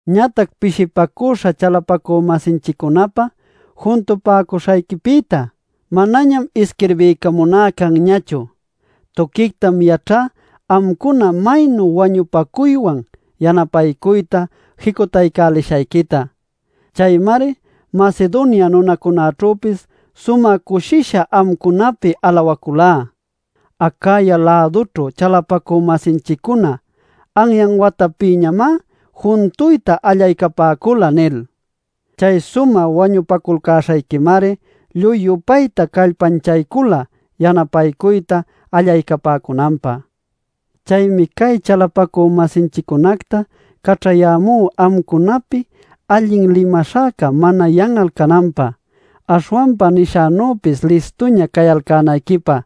Ñatac pishipacüśha chalapacü-masinchiccunapä juntupäcuśhayquipïtá manañam isquirbiycamuná canñachu. Tuquictam yaćhá amcuna maynu wañupacuywan yanapaycuyta jicutaycälishayquita. Chaymari Macedonia nunacunäćhüpis sumä cushisha amcunapïta alawaculá: “Acaya-lädućhu chalapacü-masinchiccuna anyan watapïñamá juntuyta allaycapäcula” nil. Chay sumä wañupaculcäśhayquimari lluy-yupayta callpanchaycula yanapayta allaycapäcunanpä. Chaymi cay chalapacü-masinchiccunacta caćhayämú amcunapi allin limaśhäca mana yan'al cananpä, aśhwanpa nishänüpis listuña cayalcänayquipä.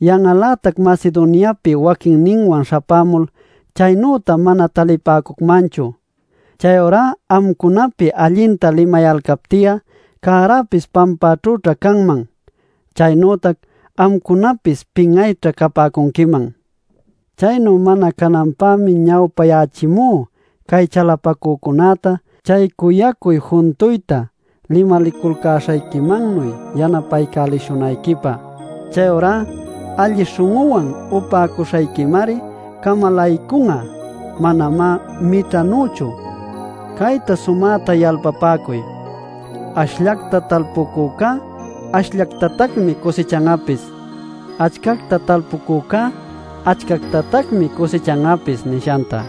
Yan'al-lätac Macedoniapi waquinninwan śhapämul chaynüta mana talipäcucmanchu. Chayurá amcunapi allinta limayalcapti'a cäräpis pampäćhüćha canman. Chaynütac amcunapis pin'ayćha capäcunquiman. Chaynu mana cananpämi ñawpayächimú cay chalapacücunäta chay cuyacuy juntuyta limaliculcäśhayquimannuy yanapaycälishunayquipä. Chayurá alli śhun'uwan upäcuśhayquimari camalaycun'a, manamá mićhanüchu. Cayta sumäta yalpapäcuy: “Ashllacta talpucücá ashllactatacmi cusichan'apis; achcacta talpucücá achcactatacmi cusichan'apis” nishanta.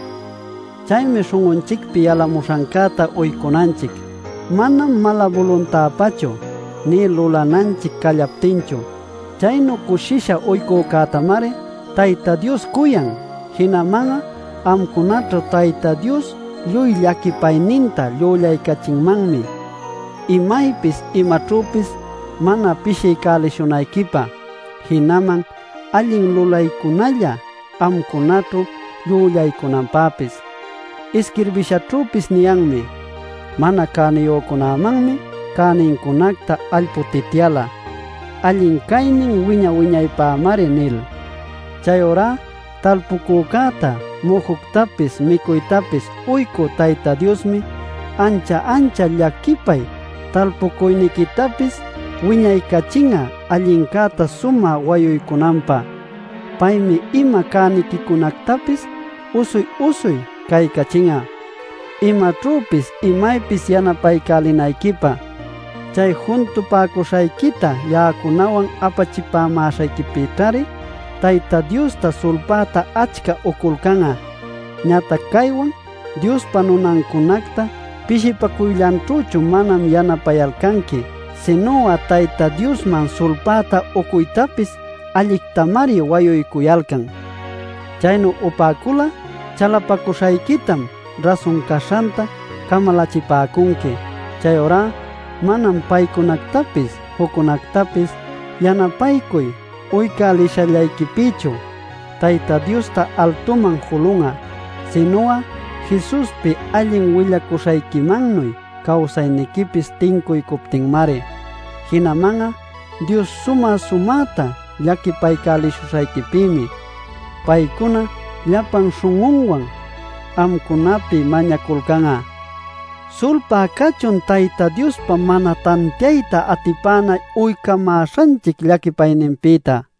Chaymi śhun'unchicpi yalamuśhancäta uycunanchic, manam mala-buluntäpachu, nï lulananchic callaptinchu. Chaynu cushisha uycücätamari Tayta Dios cuyan. Jinaman'a amcunaćhu Tayta Dios lluy llaquipayninta llüllaycachinmanmi imaypis imaćhüpis mana pishiycälishunayquipä, jinaman allin lulaycunalla amcunaćhu llüllaycunanpäpis. Isquirbishaćhüpis niyanmi: “Mana cäniyücunämanmi cänincunacta ayputityäla; allin caynin wiña-wiñaypämari” nil. Chayurá talpucücäta mujuctapis micuytapis uycü Tayta Diosmi ancha ancha llaquipay talpucuyniquitapis wiñaycachin'a allincäta sumä wayuycunanpä. Paymi ima cäniquicunactapis usuy-usuy caycachin'a imaćhüpis imaypis yanapaycälinayquipä. Chay juntupäcuśhayquita ya'acunawan apachimäśhayquipïćhari Tayta Diosta sulpayta achca uculcan'a. Ñatac caywan Diospa nunancunacta pishipacuyllanćhüchu manam yanapayalcanqui, sinu'a Tayta Diosman sulpäta ucuytapis allictamari wayuycuyalcan. Chaynu upäcul'a chalapacuśhayquitam rasun caśhanta camalachipäcunqui. Chayurá manam paycunactapis juccunactapis yanapaycuy uycälishallayquipïchu Tayta Diosta altuman julun'a, sinu'a Jesuspi allin willacuśhayquimannuy cawsayniquipis tincuycuptinmari. Jinaman'a Dios sumä-sumäta llaquipaycälishuśhayquipïmi paycuna llapan śhun'unwan amcunapi mañaculcan'a. ¡Sulpay cachun Tayta Diospa mana tantiayta atipana uycamäśhanchic llaquipayninpïta!